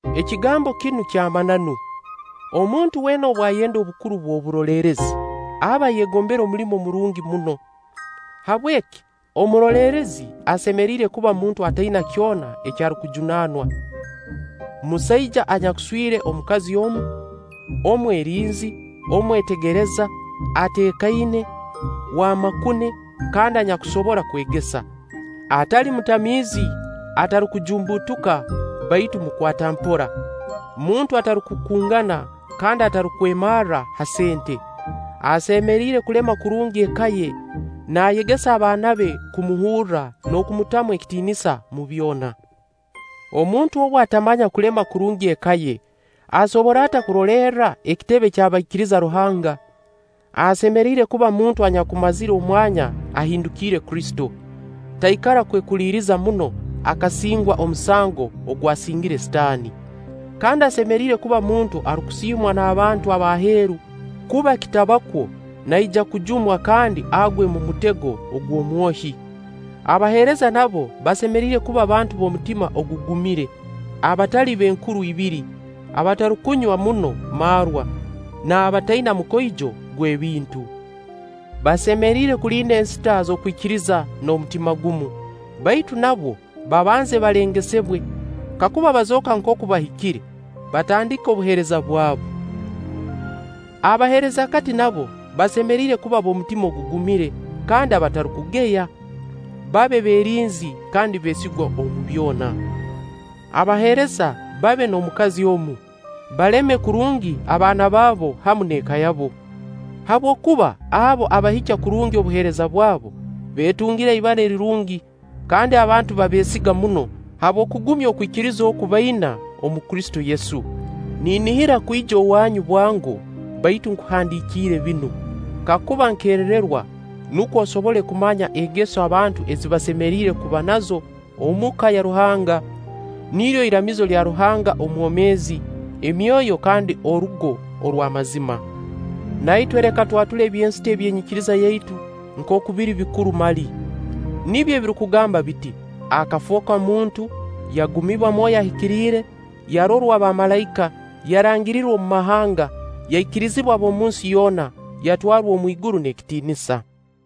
Ekigambo kinu ky'amananu: Omuntu weena obu ayenda obukuru bw' oburoleerezi, aba ayegombere omulimo murungi muno. Habweki omuroleerezi asemeriire kuba muntu ataina kyona eki arukujunaanwa; musaija anyakuswire omukazi omu, omwerinzi, omwetegereza, ateekaine, w'amakune, kandi anyakusobora kwegesa. Atali mutamiizi, atarukujumbuutuka baitu mukwata mpora. Muntu atarukukungana kandi atarukwemarra ha sente. Asemeriire kulema kurungi eka ye naayegesa abaana be kumuhurra n'okumutamu ekitiinisa omu byona. Omuntu obu atamanya kulema kurungi eka ye, asobora ata kurolerra akitebe ky'abaikiriza Ruhanga? Asemeriire kuba muntu anyakumazire omwanya ahindukiire Kristo, taikara kwekuliriza muno akasingwa omusango ogwasingire Sitaani. Kandi asemeriire kuba muntu arukusiimwa n'abantu ab'aheeru, kuba kitaba kwo naija kujumwa kandi agwe omu mutego gw'Omwohi. Abaheereza nabo basemeriire kuba bantu b'omutima ogugumire, abatali b'enkuru ibiri, abatarukunywa muno marwa, n'abataina mukoijo gw'ebintu. Basemeriire kulinda ensita z'okwikiriza n'omutima gumu. Baitu nabwo, babanze balengesebwe. Kakuba bazooka nkooku bahikire, batandike obuheereza bwabu. Abaheerezakati nabo basemeriire kuba b'omutima ogugumire kandi abatarukugeya. Babe beerinzi kandi beesigwa omu byona. Abaheereza babe n'omukazi omu, baleme kurungi abaana babo hamu n'eka yabo; habwokuba abo abahikya kurungi obuheereza bwabo, beetungira ibara lirungi kandi abantu baabeesiga muno habw'okugumya okwikiriza oku baina omu Kristo Yesu. Ninihira kwija owaanyu bwango, baitu nkuhandiikire binu, kakuba nkererwa, nukwo osobole kumanya engeso abantu ezi basemeriire kuba nazo omu ka ya Ruhanga. Niryo iramizo lya Ruhanga omwomeezi, enyomyo kandi orugo orw'amazima. Na itwe leka twatule eby'ensita eby'enyikiriza yaitu nkooku biri bikuru mali. Nibyo ebirukugamba biti: Akafooka muntu, yagumibwa Mwoyo Ahikiire, yarorwa bamalaika, yarangirirwa omu mahanga, yaikirizibwa ab'omunsi yoona, yatwarwa omu iguru n'ekitiinisa.